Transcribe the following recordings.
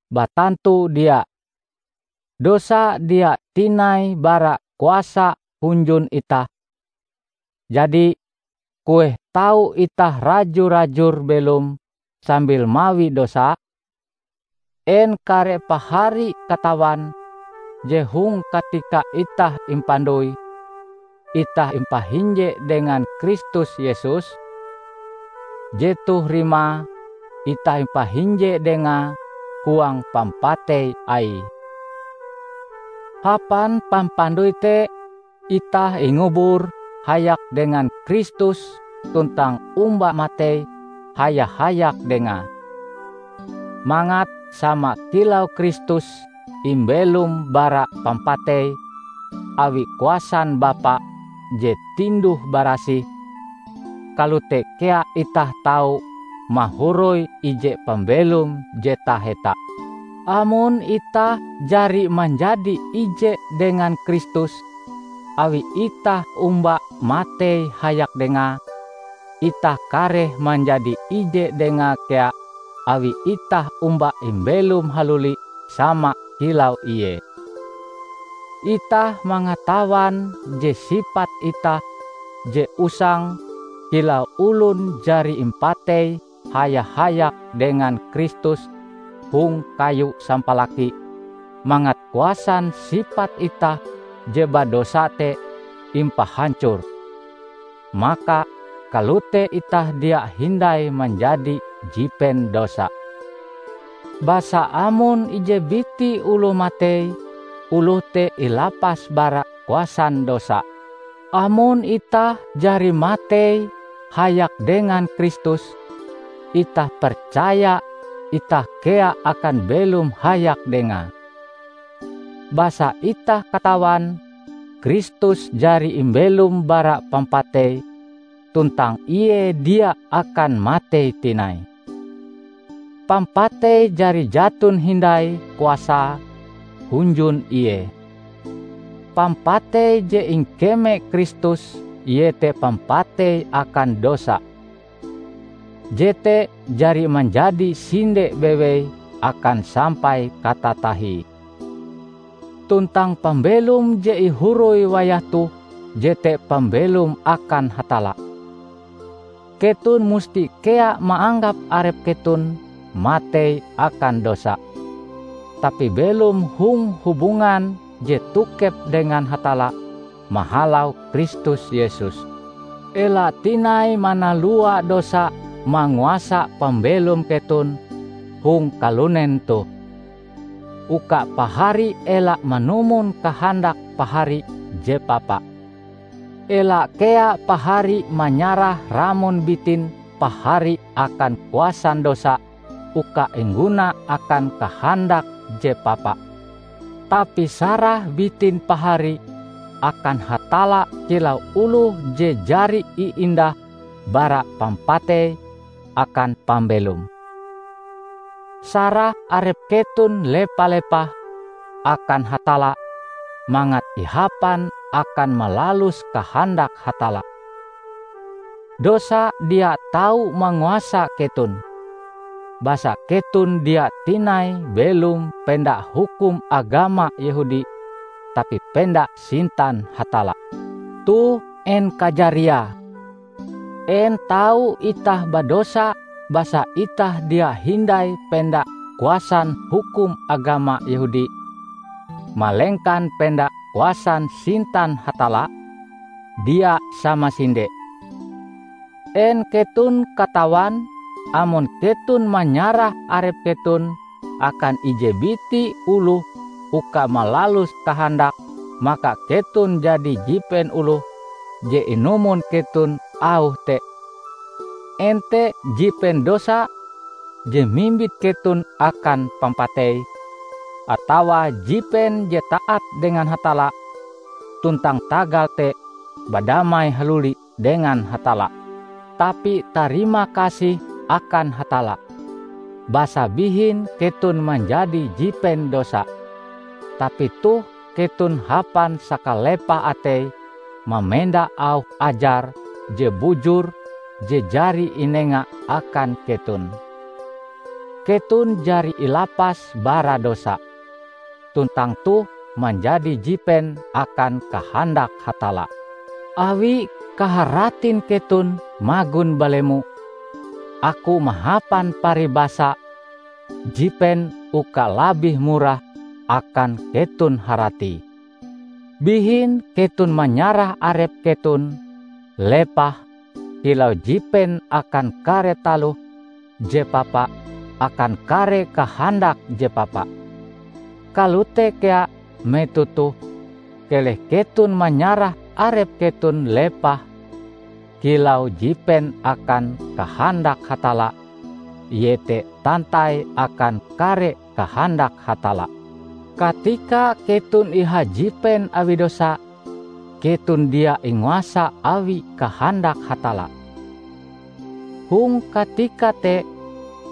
Batantu dia! Dosa dia tinai bara kuasa hunjun itah, jadi, kueh tau itah raju-rajur belom sambil mawi dosa? En kare pahari katawan je hong katika itah impandoi, itah impahinje dengan Kristus Yesus? Jetoh rimae itah impahinje Dengae huang pampatei Aie. Hapan pampandoi te, itah ingubur hayak dengan Kristus tuntang omba matei haya-hayak Dengae, mangat sama kilau Kristus imbelom bara pampatei awi kuasan Bapa je tinduh-barasih, kalote kea itah tau mahoroi ije pambelom je taheta. Amon itah jari manjadi ije dengan Kristus awi itah omba matei hayak Dengae, itah kareh manjadi ije Dengae kea awi itah omba imbelom haluli sama kilau Ie. Itah mangatawan je sipat itah je usang kilau olon jari impatei haya-hayak dengan Kristus hong kayu sampalaki mangat kuasan sipat itah je badosa te impahancor; maka kalote itah dia hindai manjadi jipen dosa. Basa amon ije biti oloh matei, oloh te ilapas bara kuasan dosa. Amon itah jari matei hayak dengan Kristus, itah percaya itah kea akan belom hayak Dengae. Basa itah katawan Kristus jari imbelom bara pampatei tuntang Ie dia akan matei tinai, pampatei jari jaton hindai kuasae hunjun Ie. Pampatei je ingkeme Kristus iete pampatei akan dosa. Jete jari manjadi sinde bewei akan sampai katatahie. Tuntang pambelom je ihoroi wayah toh jete pambelom akan Hatalla. Keton musti kea maanggap arep keton matei akan dosa, tapi belom hong hubungan je tokep dengan Hatalla mahalau Kristus Yesus. Ela tinai manalua dosa manguasa pambelom keton hong kalunen toh, uka pahari ela manumon kahandak pahari je papa. Ela kea pahari manyarah ramon bitin pahari akan kuasan dosa uka ingguna akan kahandak je papa. Tapi sarah bitin pahari akan Hatalla kilau oloh je jari iindah bara pampatei akan pambelom. Sarah arep keton lepa-lepah akan Hatalla mangat ihapan akan malalus kahandak Hatalla. Dosa dia tau manguasa keton, basa keton dia tinai belom penda hukum agama Yehudi tapi penda sintan Hatalla. Toh, en kajariae? En tau itah badosa basa itah dia hindai penda kuasan hukum agama Yehudi, malengkan penda kuasan sintan Hatalla? Dia samasinde! En keton katawan amon keton manyarah arep keton akan ije biti oloh uka malalus kahandake maka keton jadi jipen oloh je inumon keton auhe te -- en te jipen dosa je mimbit keton akan pampatei, atawa jipen je taat dengan Hatalla, tuntang tagal te badamai haluli dengan Hatalla. Tapi tarima kasih akan Hatalla! Basa bihin keton manjadi jipen dosa, tapi toh keton hapan sakalepah atei mamenda auh ajar je bujur je jari inenga akan keton. Keton jari ilapas bara dosa, tuntang toh manjadi jipen akan kahandak Hatalla. Awi kaharatin keton magon balemo, aku mahapan paribasa jipen uka labih murah akan keton haratie. Bihin keton manyarah arep keton lepah kilau jipen akan kare taloh je papa akan kare kahandak je papa. Kalote kea metoh toh keleh keton manyarah arep keton lepah kilau jipen akan kahandak Hatalla iete tantai akan kare kahandak Hatalla. Katika keton ihajipen awi dosa, keton dia inguasa awi kahandak Hatalla. Hong katika te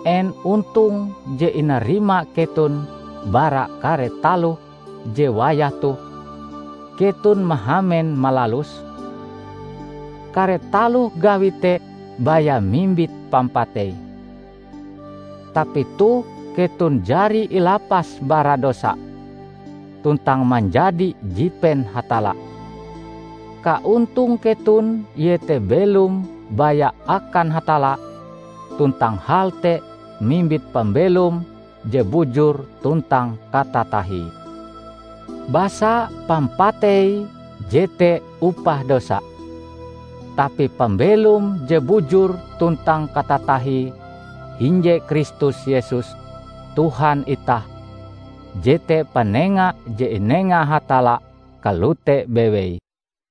en ontong je inarima keton bara kare taloh je wayah toh keton mahamen malaluse? Kare taloh gawi te baya mimbit pampatei! Tapi toh keton jari ilapas bara dosa, tuntang manjadi jipen Hatalla. Kaontong keton iete belom baya akan Hatalla tuntang hal te mimbit pambelom je bujur tuntang katatahie. Basa pampatei jete upah dosa; tapi pambelom je bujur tuntang katatahie hinje Kristus Yesus Tuhan itah jete panenga je inenga Hatalla kalote bewei.